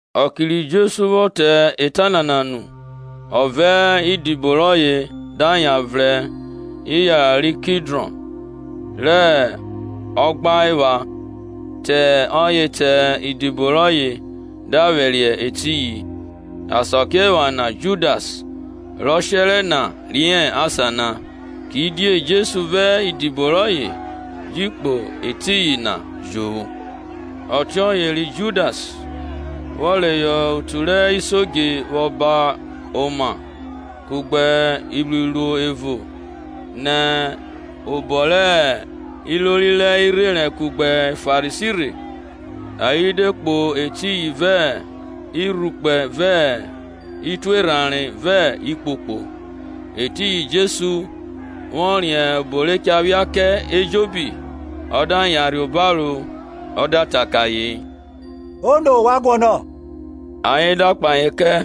Ọke ri Jesu vwọ ta eta nana nu, ọ vẹ idibo rọye da yan vrẹn iyara ri Kidrọn, rẹ ogba epha, te ọye te idibo rọye da vwẹriẹ etiyin. Asakiephana Judas, rọ shẹrẹ na riẹn asan na; kidie Jesu vẹ idibo rọye ji kpo etiyin jovwo. Ọtiọye ri Judas, vwọ reyọ otu rẹ isodje vwọ ba oma kugbe iruiruo evo nẹ obọ rẹ ilori rẹ irherẹn kugbe Farisi rhe, ayen de kpo etiyin vẹ irhukpẹ vẹ ituerhanre vẹ ikpokpo. Etiyin Jesu, vwọ riẹn obo re cha phia kẹ ejobi, ọ da yanrhe obaro ọ da ta kẹ ayen, Ono ovwan guọnọ? Ayen da kpahe kẹ,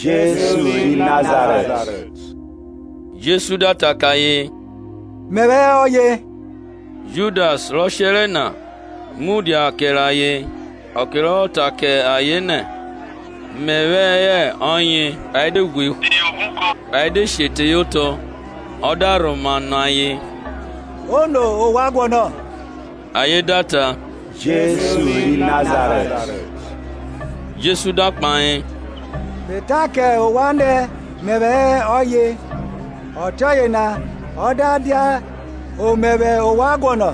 Jesu ri Nazarẹt. Jesu da ta kẹ ayen, Mẹvwẹ hẹ ọye. Judas rọ shẹrẹ na, mudia kẹrẹ ayen. Ọke rọ vwọ ta kẹ ayen nẹ, Mẹvwẹ hẹ ọye, ayen de ghwe sihọ obuko ayen de she teye otọ. Ọ da rhoma nọ ayen, Ono ovwan guọnọ? Ayen da ta, Jesu ri Nazarẹt. Jesu da kpahe, Me ta kẹ ovwan nẹ mẹvwẹ hẹ ọye; ọtiọye na, o da dia omẹvwẹ ovwan guọnọ,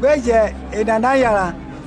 gbe jẹn enana yanran.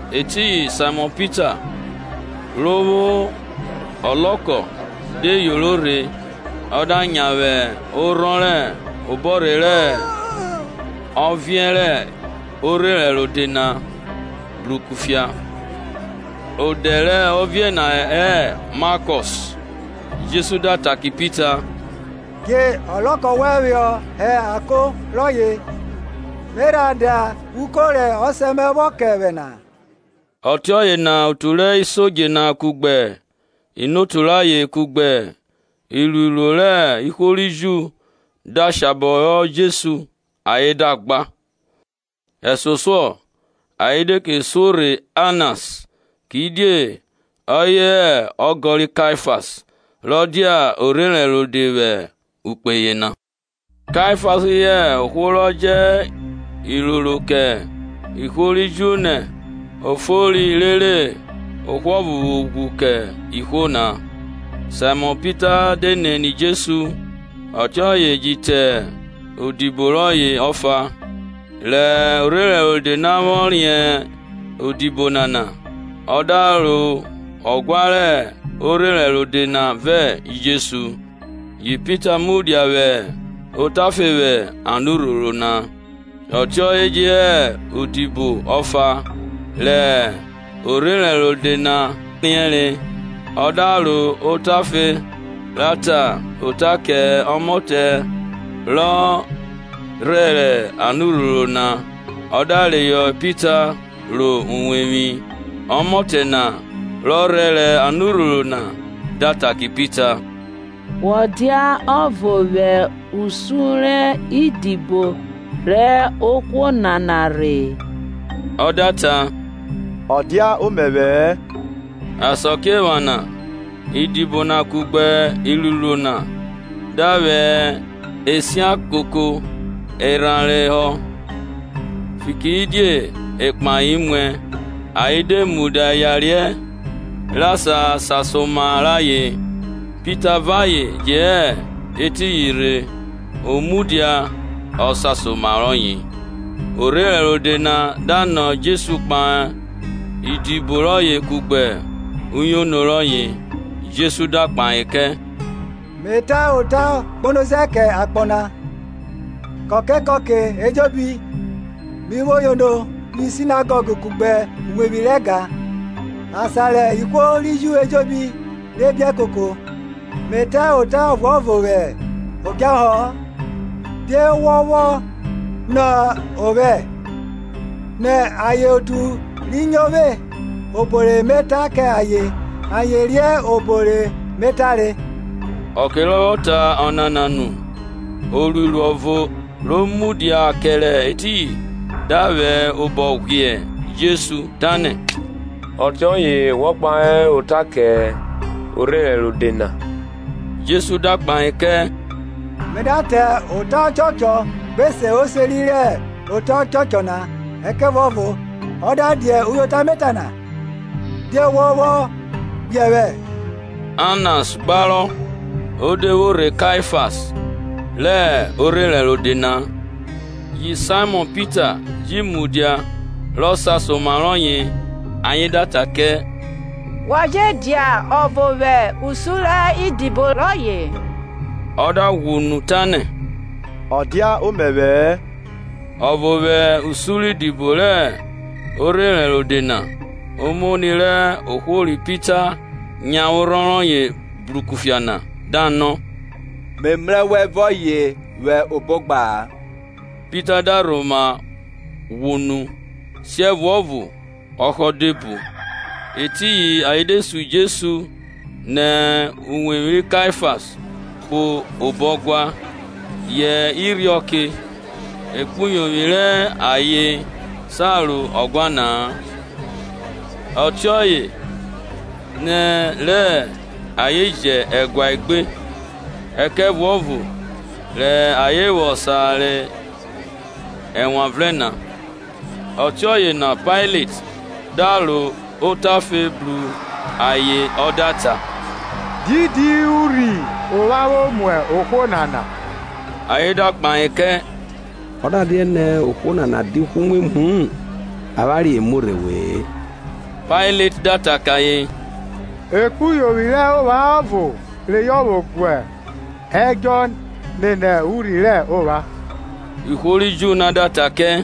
Etiyin Saimọn Pita, ro vwo ọlọkọ, de yoro rhe ọ da nyavwe orhọn rẹ obọrhe rẹ ọviẹn rẹ orherẹn rode na bru kufia. Odẹ rẹ ọviẹn na hẹ Makos. Jesu da ta kẹ Pita, Dje ọlọkọ wẹn vwọ hẹ ako rọye; Me rha da uko rẹ Ọsẹ mẹ vwọ kẹ vwẹ na? Ọtiọye na otu rẹ isodje na kugbe inotu rayen kugbe iruiruo rẹ ihwo ri Ju de shabọ họ Jesu ayen da gba. Ẹsosuọ ayen de ke suo rhe Anas; kidie ọye hẹ ọgọ ri Kaifas, rọ dia orherẹn rode vwẹ ukpe yena. Kaifas hẹ ohwo rọ ta kẹ ihwo ri Ju nẹ o fori rere ohwo ọvo vwo ghwu kẹ ihwo na. Saimọn Pita de nene Jesu, ọtiọye je te odibo rọye ọfa. Rẹ orherẹn rode na vwọ riẹn odibo nana, ọ da ro ọguan rẹ orherẹn rode na vẹ Jesu, yi Pita mudia vwẹ otafe vwẹ anurhoro na. Ọtiọye je hẹ odibo ọfa, rẹ orherẹn rode na riẹnre, ọ da ro otafe ra ta ota kẹ ọmọtẹ rọ rhẹrẹ anurhoro na, ọ da reyọ Pita ro uwevwi. Ọmọtẹ na rọ rhẹrẹ anurhoro na da ta kẹ Pita, Wọ dia ọvo vwẹ usun rẹ idibo rẹ ohwo nana rhe? Ọ da ta, Ọ dia omẹvwẹ-ẹ. Asakiephana idibo na kugbe iruiruo na da vwẹ esia koko erhanre họ, fikiridie ekpahe muẹ, ayen de mudia yariẹ re sasa oma rẹ ayen; Pita vẹ ayen je hẹ etiyin rhe, o mudia rọ sasa oma rọye. Orherẹn rode na da nọ Jesu kpahe idibo rọye kugbe uyono rọye. Jesu da kpahe kẹ, Me ta ota gbonoze kẹ akpọ na. Kọke kọke ejobi mi vwo yono vwi Sinagọg kugbe uwevwi rẹ ẹga, asan rẹ ihwo ri Ju ejobi de koko, Me ta ota ọvuọvo vwẹ odjahọ-ọ. Die wọ vwọ nọ vwẹ? Nọ ayen otu ri nyo vwe, obo re me ta kẹ ayen; ayen riẹn obo re me tare. Ọke rọ vwọ ta ọnana nu, oruiruo ọvo ro mudia kẹrẹ etiyin da vwẹ obọ ghwiẹ Jesu, tanẹ, ọtiọye wọ kpahe ota kẹ orherẹn rode na? Jesu da kpahe kẹ, Me da ta ota ọchọchọ, gbe se oseri rẹ ota ọchọchọ na; ẹkẹvuọvo ọ da dia uyota me ta na, die wọ vwọ ghwiẹ vwẹ? Anas gbarọ o de vwo rhe Kaifas rẹ orherẹn rode na. Ri Saimọn Pita ji vwo mudia rọ sasa oma rọye na, ayen da ta kẹ, Wọ je dia ọvo vwẹ usun rẹ idibo rọye? Ọ da ghwọ unu tanẹ, ọ dia omẹvwẹ-ẹ. Ọvo vwẹ usun rẹ odibo rẹ orherẹn rode na, omoni rẹ ohwo ri Pita nyavwe orhọn rọye bru kufia na, da nọ, Me mrẹ wẹ vẹ ọye vwẹ obo ogba na? Pita da rhoma ghwọ unu; siẹvuọvo ọhọ de whe bo. Etiyin ayen de sun Jesu nẹ uwevwi ri Kaifas kpo obo ọguan rẹ Pailet vwẹ irhiọke. Ekpuyovwi rẹ ayen sa ro ọguan na-a, fikirẹ obo rẹ ayen vwo jẹ ẹgua egbe, ẹkẹvuọvo re ayen vwo sa re ẹwanvrẹn na. Ọtiọye na Pailet da ro otafe bru ayen ọ da ta, Didi urhi ovwan vwo mu ohwo nana? Ayen da kpahe kẹ, Ọ da dianẹ ohwo nana dia ohwoumwemwu-u, avwanre e muo rhe we-e. Pailet da ta kẹ ayen, Ekpuyovwi rẹ ovwan ọvo reyọ vwo gu ẹdjọ nene urhi rẹ ovwan. Ihwo ri Ju na da ta kẹ,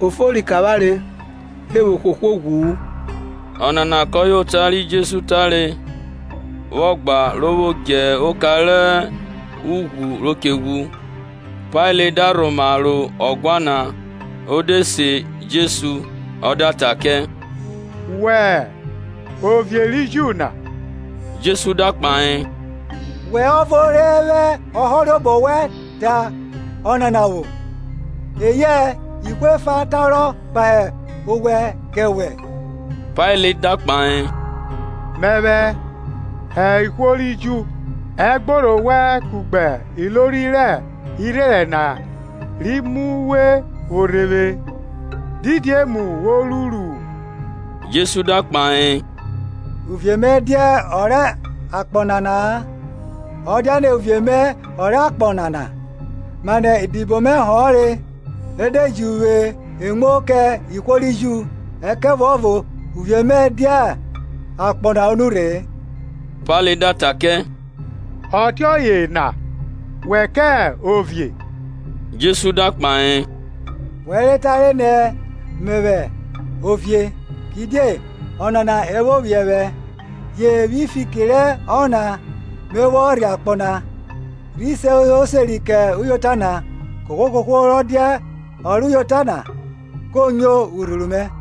Ọ fori kẹ avwanre re vwo hwe ohwo ghwu-u. Ọnana kọye ota ri Jesu tare vwọ gba ro vwo dje oka rẹ ughwu ro che ghwu. Pailet da rhoma ro ọguau na o de se Jesu, ọ da ta kẹ, Wẹ hẹ ovie ri Ju na? Jesu da kpahe, Wẹ ọvo re vwẹ ọhọrobọ wẹn ta ọnana vwo, eyẹ ihwo efa tarọ kpahe ovwẹ kẹ wẹ? Pailet da kpahe, Mẹvwẹ hẹ ihwo ri Ju? Ẹgborho wẹn kugbe ilori rẹ irherẹn na ri mu uwe vwo rhe vwe; Didi emu wo ruru? Jesu da kpahe, Uvie mẹ dia ọ rẹ akpọ nana-a; ọ dianẹ uvie mẹ ọ rẹ akpọ nana, manẹ idibo mẹ a họnre, re de ji uvwe emuo kẹ ihwo ri Ju; ẹkẹvuọvo uvie mẹ dia akpọ o nurhe-e. Pailet da ta kẹ, Ọtiọye na wẹ kẹ ovie? Jesu da kpahe, We rẹ tare nẹ mẹvwẹ ovie. Kidie ọnana e vwo vwiẹ vwẹ, je vwi fiki rẹ ọnana me vwọ rhe akpọ na, rhi se oseri kẹ uyota na. Kohwo kohwo rọ dia ọ rẹ uyota na ko nyo urhuru mẹ.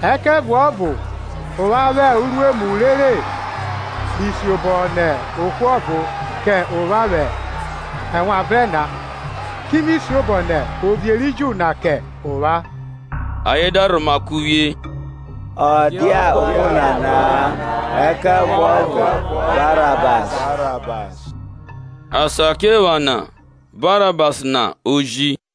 Ẹkẹvuọvo ovwan vwo uruemu rere mi siobọ nẹ ohwo ọvo kẹ ovwan vwẹ ẹwanvrẹn na, ki mi siobọ nẹ Ovie ri Ju na kẹ ọvwan? Ayen da rhoma kuvwie, Ọ dia ohwo nana, ẹkẹvuọvo Barabas. Asakiephana Barabas na oji.